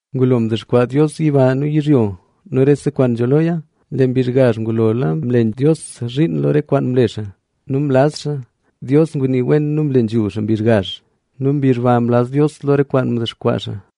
Ngulo mdexkwaa Dios yiba nu yizhyo nu rese kwaan nzho loya. Lee mbizh gazh ngulo mle Dios zhiin lo re kwaan mle xaa nu mlaz xaa. Dios ngunii wen nu mle nambey xaa mbizh gazh nu mbizh ba mlaz Dios lo re kwaan mdexkwaa xaa.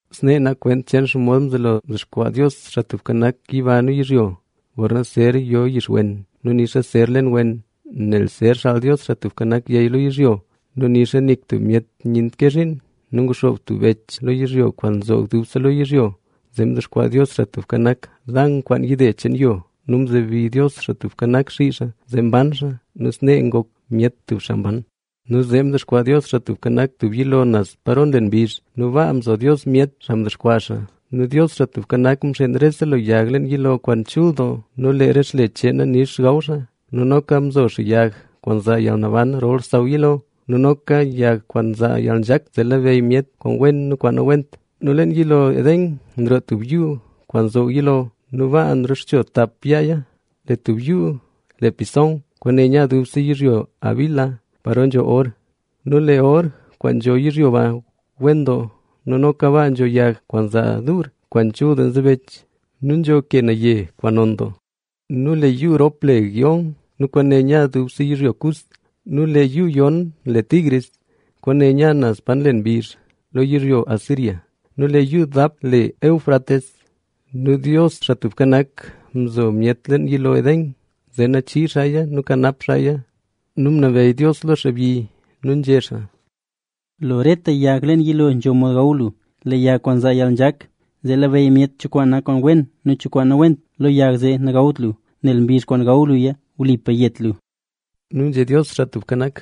Snee nak kwent cheen xomod mzelo mdexkwaa Dios, Xaa Tubka Nak, yiba nu yizhyo. Gorna zer yo yixwen nu nixa zer len wen, nel zer xaal Dios, Xaa Tubka Nak, yey lo yizhyo nu nixa nik tub myet nyent ke zhiin; nu nguxoob tub bech lo yizhyo kwaan nzoog dubse lo yizhyo. Zee mdexkwaa Dios, Xaa Tubka Nak, Dana kwaan yide cheen yo. Nu mzebi Dios, Xaa Tubka Nak, xii xaa, zee mban xaa. Nu snee ngok myet tub xaa mban. Nu zee mdexkwaa Dios, Xaa Tubka Nak, tub yilo naz paro nlen mbizh nu baa mzo Dios myet, xaa mdexkwaa xaa. Nu Dios, Xaa Tubka Nak, mxeen rese lo yag leen yilo kwaan chul doo nu lee re xle cheena nix gaw xaa. Nu noka mzo xaa yag kwaan nzaa yalnaban rol xsaw yilo nu noka yag kwaan nzaa yalnzhak, zee labeyy myet kwaan wen nu kwaan nawent. Nu leen yilo Edén nroo tub yuu kwaan nzoog yilo. Nu baa nrexcho tap yaaya. Lee tub yuu le Pisón, kwaane nya dubse yizhyo Havila paro nzho or. Nu lee or kwaan nzho yizhyo ba wen doo. Nu noka baa nzho yag kwaan nzaa duur kwaan chul doo nzebech nu nzho ke naye kwaan non doo. Nu lee yuu rop le Gihón nu kwaane nya dubse yizhyo Cus. Nu lee yuu yon le Tigris, kwaane nya naz pa nlen mbizh, lo yizhyo Asiria. Nu lee yuu dap le Éufrates. Nu Dios, Xaa Tubka Nak, mzo myet leen yilo Edén, zee nachii xaaya nu kanap xaaya. Nu ngunabeyy Dios lo xaabyi nu nzhé xaa: “Lo rete yag leen yilo nzho mod gaw lu. Lee yag kwaan nzaa yalnzhak, zee labeyy myet cho kwaan wen nu cho kwaan nawent, lo yag zee nagawt lu, nel mbizh kwaan gaw luya, wlipa yet lu.” Nu nzhé Dios, Xaa Tubka Nak: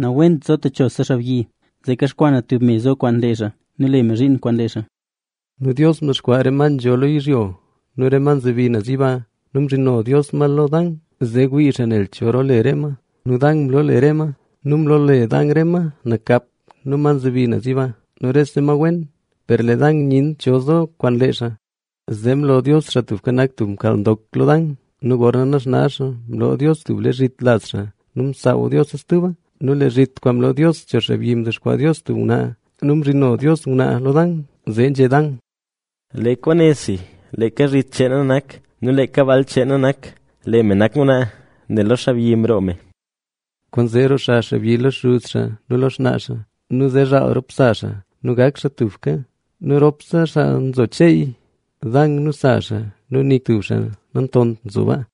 “Nawent nzo techose xaabyi, zee kaxkwaa na tub me zo kwaan lee xaa nu le me zhiin kwaan lee xaa”. Nu Dios mdexkwaa re ma nzho lo yizhyo nu re ma nzebi naz yiba nu mzhino Dios ma lo Dan, zee wii xaa ne cho roole re ma. Nu Dan mloole re ma. Nu mloole Dan re ma nakap nu ma nzebi yiba nu rese ma wen, per lee Dan nyent cho zo kwaan lee xaa. Zee mlo Dios, Xaa Tubka Nak, tub mkaal ndok lo Dan; nu gorna naxna xaa, mloo Dios tub lee zhit laz xaa nu msaaw Diosa stuba. Nu lee zhit kwaan mloo Dios cho xaabyi mdexkwaa Dios tub ngwnaa. Nu mzhino Dios ngwnaa lo Dan. Zee nzhé Dan: ¡Lee kwaane si, leeka zhit cheen na nak nu leeka baal cheen na nak! Lee me nak ngwnaa, nel lo xaabyi mroo me. Kwaanzee lee xaabyi lo xuz xaa nu lo xnaa xaa nu chelya rop sa xaa, zee tubka kwerp gak rop xaa. Nu ropse xaa nzo cheey Dan nu sa xaa nu nik tub xaa nantont nzo sbaa.